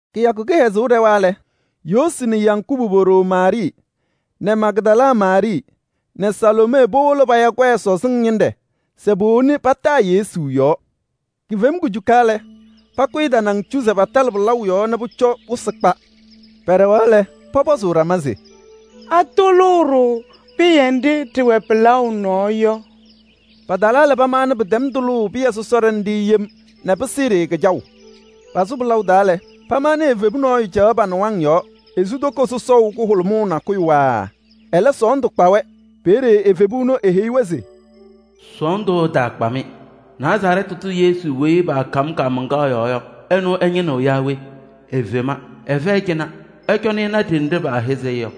Kɩyakʋ kɩhɛzʋʋ ɖɛwa lɛ, Yoosi nɛ Yakubu po-ɖoo Maarɩɩ nɛ Magdala Maarɩɩ nɛ Saloomee powolo paya kɔyɛ sɔzɩŋ ñɩnɖɛ se powoni pataa Yesu yɔɔ. Kifem kujuka lɛ, pakʋyɩ tanaŋ cu se patalɩ pɩlaʋ yɔɔ ɛzɩ wɩsɩ yaɣʋ keɖe yɔ. Pɛɖɛɣaɣ lɛ, pɔpɔzʋʋ ɖama se: “Atʋlʋʋ-ɖʋ pɩyɛ nɖɩ ɖɩwɛ pɩlaʋ nɔɔ yɔ?” Patalaa lɛ, panaɣ pɩtɛm tʋlʋʋ pɩyɛ sɔsɔɖɛ nɖɩ yem nɛ pɩsɩɩ-ɖɩ kɩjaʋ. Pasʋ kɩ-taa lɛ, pamaɣnɩ evebu nɔɔyʋ caɣ pa-nɩwaŋ yɔɔ. Esu toko sɔsɔʋ kʋhʋlʋmʋʋ nakʋyʋ waaa, ɛlɛ sɔɔndʋ kpa-wɛ. Peeye evebu ɛnʋ eheyi-wɛ se: “Sɔɔndʋ ɛtaakpa-mɩ. Nazarɛɛtɩ tʋ Yesu weyi paakam kaamaŋkaɣ yɔɔ yɔ, ɛnʋ ɩñɩnɩɣ yaa we? Efema, ɛfɛyɩ cɩnɛ. Ɩcɔnɩ ɩna ɖenɖe paahɛzɩ-ɩ yɔ.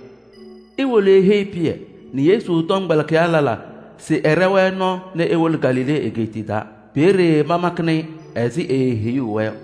Iwolo iheyi Pɩyɛ nɛ Yesu tɔmkpɛlɩkɩyaa lɛlaa se ɛɖɛ-wɛ nɔɔ nɛ ewolo Galilee egeetiye taa. Peeye pamakɩnɩ-ɩ ɛzɩ eeheyuu-wɛ yɔ.”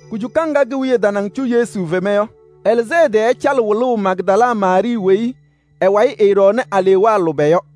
Kujuka ŋga ke-wiye tanaŋ cu Yesu fema yɔ, ɛlɩzɩ ɛ-tɩ nɛ ɛcalɩ wɩlʋʋ Magdala Maarɩɩ weyi ɛ-wayɩ ɛɛɖɔɔnɩ alewaa lʋbɛ yɔ.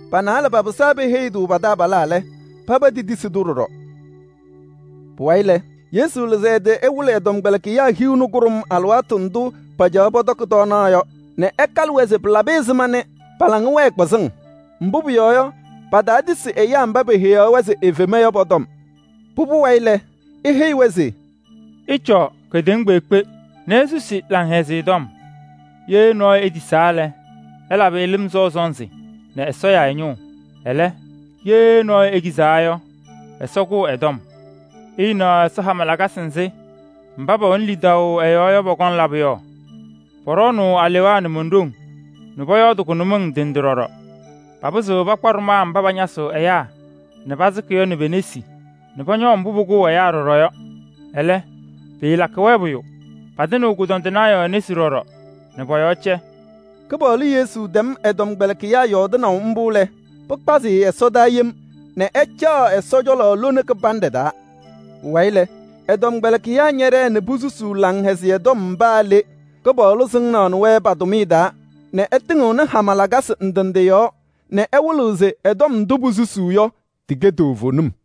Peeye paba pɩsaa nɛ peheyi pa-taabalaa lɛlaa. Ɛlɛ, paba tetisi-tʋ ɖɔɖɔ. Pʋwayɩ lɛ, Yesu lɩzɩ ɛ-tɩ nɛ ɛwɩlɩ ɛ-tɔmkpɛlɩkɩyaa hiu nɛ kʋɖʋm alɩwaatʋ ndʋ pacaɣaɣ pɔtɔkɩ tɔɔnaɣ yɔ nɛ ɛkalɩ-wɛ se pɩlabɩ ɛzɩma nɛ pa-laŋa wɛɛ kpɩzɩŋ. Mbʋ pʋyɔɔ yɔ, pataatisi ɛyaa mba peheyaɣ-wɛ se efema yɔ pɔ-tɔm. Pʋbʋ wayɩ lɛ, eheyi-wɛ se: “Ɩcɔɔ kedeŋa kpeekpe nɛ isusi ɛyaa Laŋhɛzɩyɛ Tɔm. Ye nɔɔyʋ etisaa lɛ, ɩlabɩ-ɩ lɩm sɔʋ sɔnzɩ nɛ Ɛsɔ ya ɛ-ñʋʋ. Ɛlɛ, ye nɔɔyʋ ekizaa lɛ, Ɛsɔ kʋ ɛ-tɔm. Ɩɩnaɣ Ɛsɔ hama lakasɩ nzɩ mba pɛwɛnɩ lidaʋ ɛ-yɔɔ yɔ, pɔkɔŋ labʋ yɔ: pɔɖɔɔnʋʋ alewaa nɛ mon-ɖoŋ nɛ pɔyɔɔdɩ kʋnʋmɩŋ ndɩ ndɩ ɖɔɖɔ. Papɩzɩɣ pakpa ɖʋmaa mba pañasɩɣ ɛyaa nɛ pasɩkɩ yɔ nɛ pe-nesi nɛ pɔñɔɔ mbʋ pʋkʋʋ ɛyaa yɔ ɖɔɖɔ, ɛlɛ, pɩɩlakɩ-wɛ pʋyʋ. Patɩnɩɣ kʋdɔndɩnaa yɔɔ nesi ɖɔɖɔ nɛ pɔ-yɔɔ cɛ.” Kɩpaɣlʋ Yesu tɛm ɛ-tɔmkpɛlɩkɩyaa yɔɔdɩnaʋ mbʋ lɛ, pɩkpazɩ-ɩ ɛsɔdaa yem nɛ ɛcaɣ Ɛsɔ cɔlɔ lone kɩbanɖɛ taa. Pʋwayɩ lɛ, ɛ-tɔmkpɛlɩkɩyaa ñɛɖɛɛ nɛ posusuu Laŋhɛzɩyɛ Tɔm paa le. Kɩpaɣlʋ sɩŋaɣnɩ-wɛ pa-tʋmɩyɛ taa nɛ ɛtɩŋɩɣnɩ hama lakasɩ ndɩ ndɩ yɔɔ nɛ ɛwɩlɩɣ se tɔm ndʋ posusuu yɔ, tɩkɛ toovenim.]